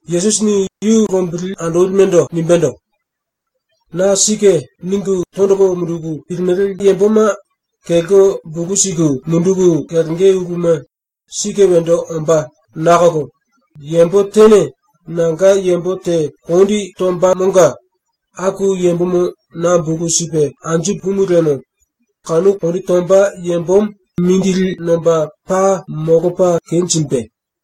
Yesusini yu lombili andolimendo nimbendo: “⸤Na⸥ ‘Sike’ ningu tondolo munduku pilimele yamboma kelko bulu siku munduku kelenge uluma sike wendo ombá nakolo yambo tene nanga yambo te kondi tombamonga aku yambomo na bulu sipe anju pumu liemo kanu kondi tomba yambomo mindili nomba paa molopa kenjimbe.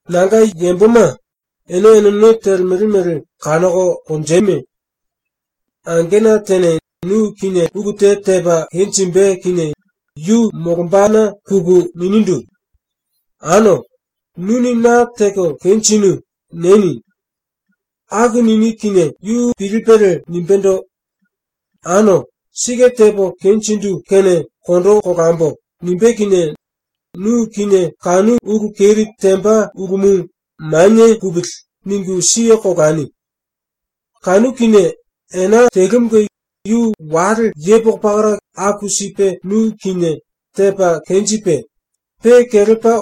“Nanga yamboma, ene eneno telemele mele kanoko konjeme. “Angena tene nu kinie ulu te tepa kenjimbe kinie yu molombana puku ninindu: “Ano, nuni na teko kenjinu.” nieni. Aku nini kinie yu pilipelie nimbéndo: “Ano, sike tepo kenjindu kene kondo kolambo.” nimbé kinie nu kinie kanu ulu keri temba ulumu ‘Manie pupili.’ ningu siye kolani. Kanu kinie ena telumunge yu wale yepoko pakara aku sipe nu kinie tepa kenjipe, pe kelepa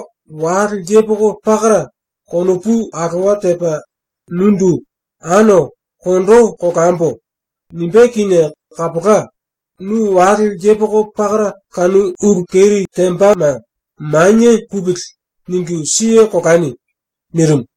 wale yepoko pakara konopu alowa tepa nundu “Ano, kondo kolambo.” nimbé kinie kapola, nu wale yepoko pakara kanu ulu keri tembama ‘Manie pupili.’ ningu siye kolani.” nirimu.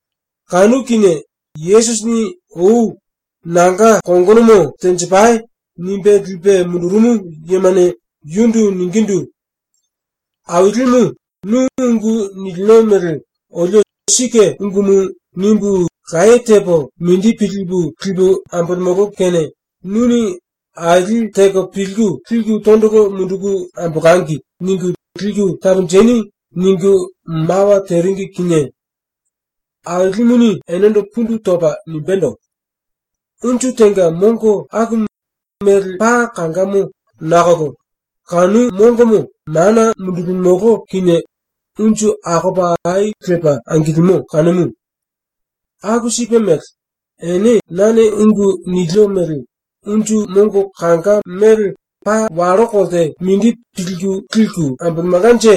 Kanu kinie Yesusini ou “Nanga kongonomo tenjipai.” nimbe lipe mundurumu yemane yundu ningindu: “Ailimu, nu ungu nilino mele olio ‘Sike ungumu.’ nimbu laye tepo mindi pilipu lipu ambolemolo kene nuni ‘aili teko pilku liku tondolo munduku ambolangi.’ ningu liku taponjeni.” ningu mawa teringi kinie ⸤Ailimuni⸥ enendo pundu topa nimbendo: “Unju tenga mongo akumu mele paa kangamo nakolo kanu mongomo mana mundulimolo kinie unju akopa ai lepa angilimo kanumu. Aku sipe mele, ene nane ungu nilio mele unju mongo kanga mele paa wallo kolte mindi pilku liku ambolemelkanje,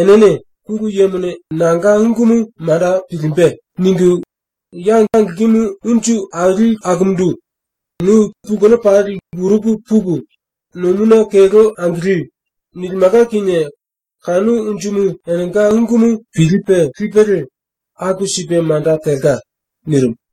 enene ‘Pulu Yemone nanga ungumu manda pilimbe.’ ningu ya angilkimu unju aili akumundu “Nu pulkeno pali lkuruku puku, nomuna kelko angili.” nilimelka kinie kanu unjumu enenga ungumu pilipe lipelie aku sipe manda telka.” ⸤nirimu.⸥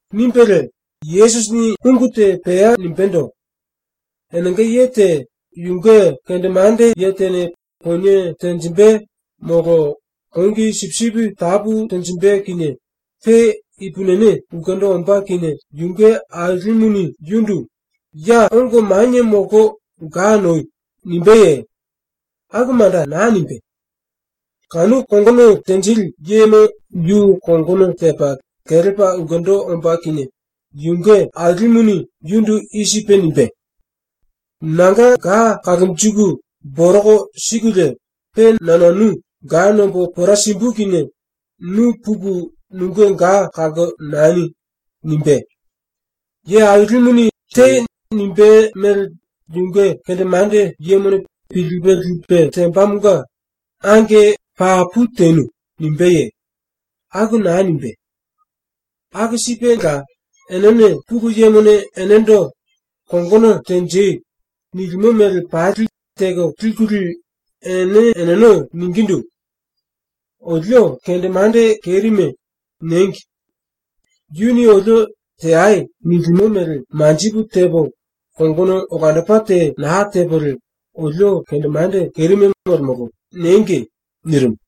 ⸤Nimbelie ungu te pea nimbéndo:⸥ “Enenga ye te yunge kendemande ye tene ponie tenjimbe molo kongi sipisipi tapu tenjimbe kinie pe ipupini ulkendo ombá kinie yunge ailimuni yundu “Ya ongo manie molko ga noi.” nimbéye? ⸤Aku manda naa nimbé.⸥ Kanu kongono tenjili yemo yu kongono tepa kelepa ulkendo ombá kinie yunge ailimuni yundu i sipe nimbé: “Nanga ga kalonjiku boroko sikulie pe na nanu ga nombo pora simbu kinie nu puku nunge ga kalko nani.” nimbé. Ye ailimuni ‘Tei.’ nimbé mele yunge kendemande yemone pilipe lipe tembamonga “Ange, papu tenu.” nimbéye? Aku naa nimbé. “Aku sipela, enene Pulu Yemone enendo “Kongono tenjei.” nilimo mele pali teko likulie ene eneno ningindu: ‘Olio kendemande kerime.’ niengi. ‘Yuni olio “Teai.” nilimo mele manjipu tepo, kongono olandopa te naa tepolie olio kendemande kerime molemolo.’ niengi.” nirimu.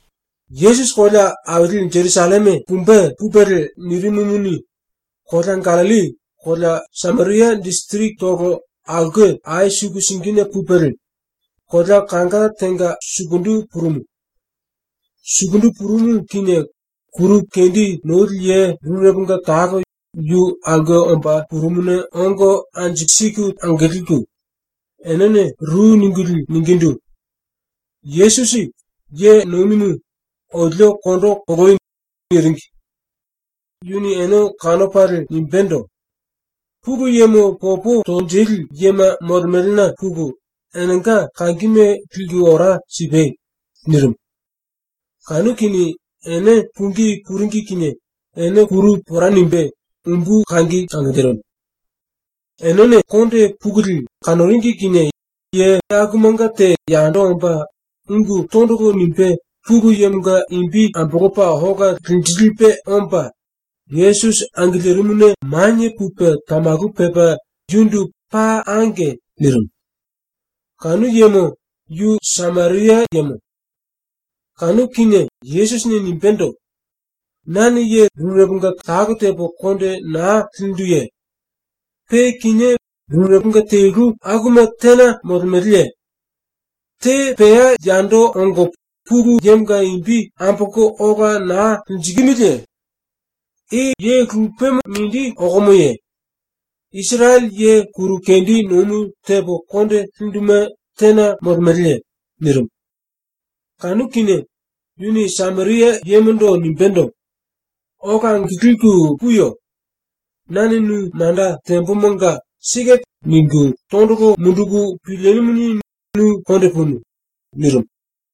Yesusi kolea aili Jerusalleme pumbe pupelie nirimumuni, kolea Gallilli kolea Sameria disirikitolo aulke ai suku singine pupelie, kolea kanga tenga sukundu purumu. Sukundu purumu kinie kuru kendi noli ye rureponga talo yu aulke omba purumuna ongo anju siku angilku enene ru ningulie ningindu: “Yesusi, Ye Nomimu, olio kondo koloi.” niringi. Yuni ene kanopalie nimbendo: “Pulu Yemo popo tonjili yema molemelena puku, enenga kangime liku ora sipai.” nirimu. Kanu kinie ene pungí puringi kinie ene kuru pora nimbe umbu kangi angilirimu. Enene konde pukulie kanoringi kinie ye akumanga te yando omba ungu tondolo nimbe Pulu Yemonga imbi ambolopa ola linjilipe omba Yesusi angilirimuna manie pupe tamalu pepa yundu “Paa ange.” nirimu. Kanu yemo yu Sameria yemo. Kanu kinie Yesusini nimbendo: “Nane ye rureponga talo tepo konde naa linduye? Pe kinié rureponga telu akuma tena molemeleye? Te pea yando ongo Pulu Yemonga imbi ambolko ola naa linjikimiliye? I ye lupemo mindi okomoye? Isirele ye kuru kendi nomu tepo konde linduma tena molemeleye?” nirimu. Kanu kinie yuni Sameria yemondo nimbendo: “Ola angilku puyo. Nane nu manda tembomonga tondolo munduku pilinumuni nu konde punu.” nirimu.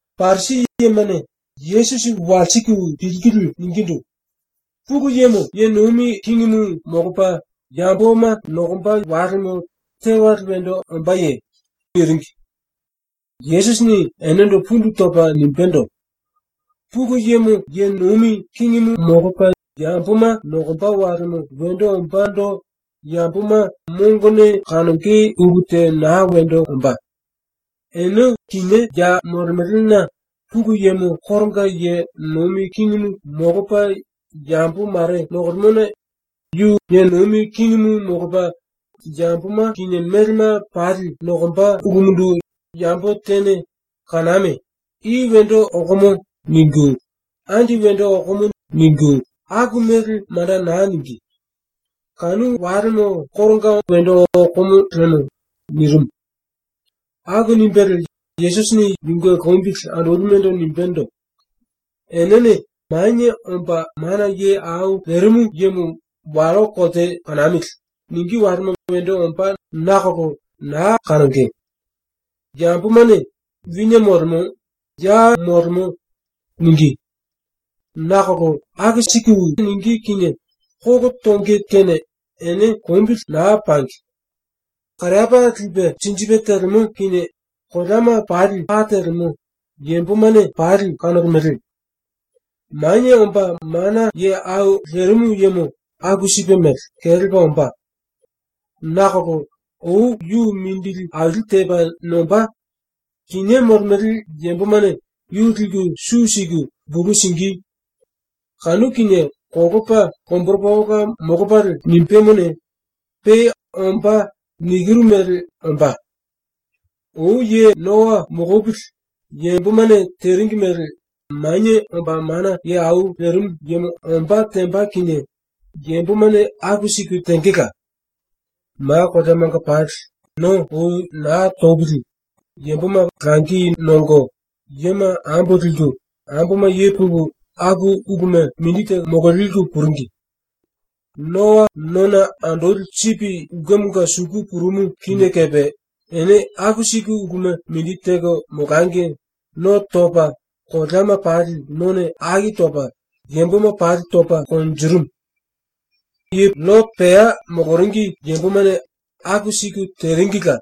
Parisi yemane Yesusi walsiku pilkulie ningindu: “Pulu Yemo ye nomi kingimu molopa yamboma nokomba walemo tewale wendo ombáye?” niringi. Yesusini enendo pundu topa nimbendo: “Pulu Yemo ye nomi kingimu molopa yamboma nokomba walemo wendo ombándo yamboma mongone kanonge ulu te naa wendo ombá. Ene kinié ya molemelena Pulu Yemo koronga ye nomi kingimu molopa yambo mare nokolemona yu ye nomi kingimu molopa yamboma kinie melema pali nokomba ulumundu yambo tene “Kaname! I wendo okomo.” ningu, “Andi wendo okomo.” ningu, aku mele manda naa ningí. Kanu walemo koronga wendo okomo lemo.” nirimu. Aku nimbelie Yesusini yunge lombili andolimendo nimbendo: “Enene “Manie Omba Mana Ye Au Lerimu Yemo wallo kolte kanamili.” ningí walema wendo ombá nakolo naa kanonge. Yambomane “Wine molemo.”, “Ya molemo.”, ningí. Nakolo aku sipe ningí kinie kolo tonge kene ene lombili naa pangi. Kariapá lipe sinjipe telemo kinie koleama pali pa telemo yambomane pali kanolemele. Manie Omba Mana Ye Au Lerimu Yemo aku sipe mele kelepa ombá. Nakolo ou yu mindili aili tepa nombá, kinié molemele yambomane yu liku su siku bulu singí. ⸤Kanu kinie kolopa lomboropa ola molopalie nimbemone,⸥ pe “Ombá.” nikiru mele ombá. “Ou ye Noa molopili yambomane teringi mele Manie Omba Mana Ye Au Lerimu Yemo ombá temba kinie yambomane aku siku tengela. ⸤Ma koleamanga pali⸥ no ou naa topili yamboma langi nongo, yema ambo liku, amboma ye puku, aku uluma mindi teko mololiku puringi. Noa nona andoli sipi ulkemonga suku purumu kinie kepe ene aku siku uluma mindi teko molangi no topa ⸤koleama pali none aki topa⸥ yamboma pali topa konjirimu. “LLote pea moloringi yambomane aku siku teringila.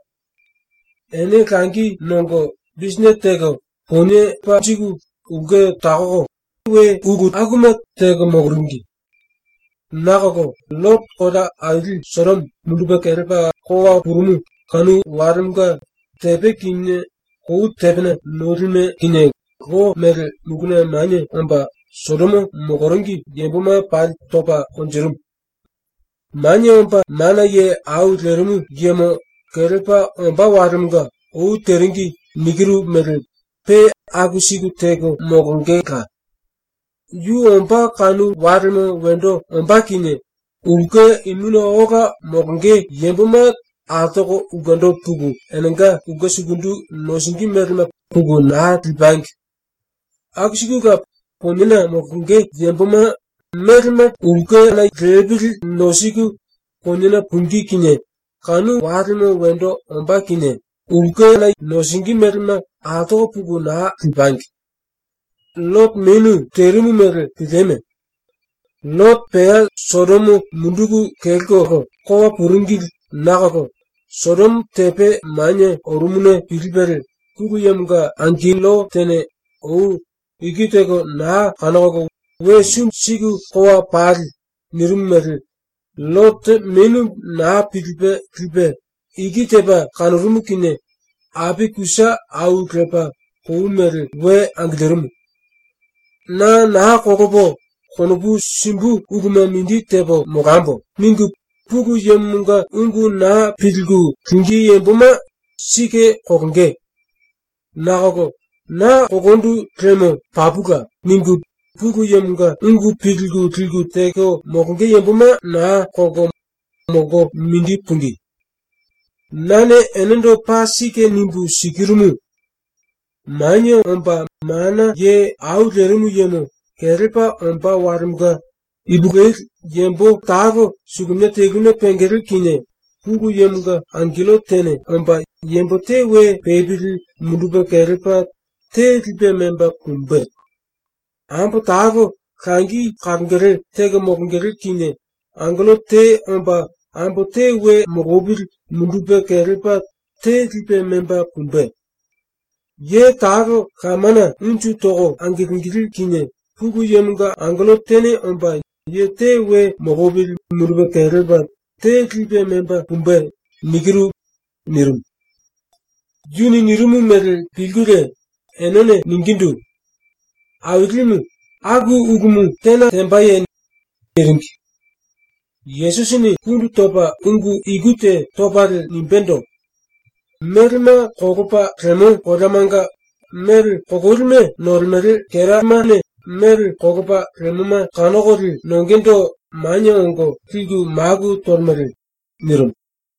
Ene langi nongo bisinete teko ponie panjiku ulke takoko, we ulu akuma teko moloringi. Nakolo LLote kolea aili Sodomo mundupe kelepa kowa purumu kanu walemonga tepe kinie kou tepene nolime kinie lo mele muluna manie omba Sodomo moloringi yamboma pali topa konjirimu. “Manie Omba Mana Ye Au Lerimu Yemo kelepa ombá walemonga ou teringi nikiru mele pe aku siku teko molongela. “Yu ombá kanu walemo wendo ombá kinie ulke imuna ola molonge yamboma altoko ulkendo puku enenga ulke sukundu nosingí melema puku naa lipangi. Aku sikula poniena molonge yamboma melema lepili nosiku poniena pungí kinie kanu walemo wendo ombá kinie nosingí melema altoko puku naa lipangi. LLote menu terimu mele pilieme. ⸤LLote pea Sodomo munduku kelkolo kowa puringili nakolo Sodomo tepe manie orumuna pilipelie Pulu Yemonga angello tene ou “Iki teko naa kanokolo we sumbi siku kowa pale.” nirimu mele LLote menu naa pilipe lipe, iki tepa kanorumu kinie api kusa au lepa kou mele we angilirimu.⸥ ‘Na naa kolopo konopu simbu uluma mindi tepo molambo.’ ningu Pulu Yemonga ungu naa pilku lingí yamboma sike kolonge. Nakolo ‘Na kolondu liemo papula.’ ningu Pulu Yemonga ungu pilku liku teko molonge yamboma naa kolko molko mindi pungí. “Nane enendo paa sike nimbu sikirumu: Manie Omba Mana Ye Au Lerimu Yemo kelepa ombá walemonga ipulueli yambo talo suluminia teluna pengele kinie ⸤Pulu Yemonga angello tene⸥ omba yambo te we pepili mundupe kelepa te lipe memba pumbe. Ambo talo langi kalongele teko molongele kinie ⸤angello te omba⸥ ambo te we molopili mundupe kelepa te lipe memba pumbe. Ye talo lamana unju toko angilingilí kinie ⸤Pulu Yemonga angello tene omba⸥ ye te we molopili mundupe kelepa te lipe memba pumbe.” nirimu. ⸤Yuni nirimu mele pilkulie⸥ enene ningindu: “Ailimu, aku ulumu tena tembaye?” niringi. Yesusini pundu topa ungu iku te topalie nimbendo: “Melema kolopa lemo koleamanga mele kololime nolemele kera ilsepema mele kolopa lemoma kanokolie nongendo manie ongo liku maku tolemele.” nirimu.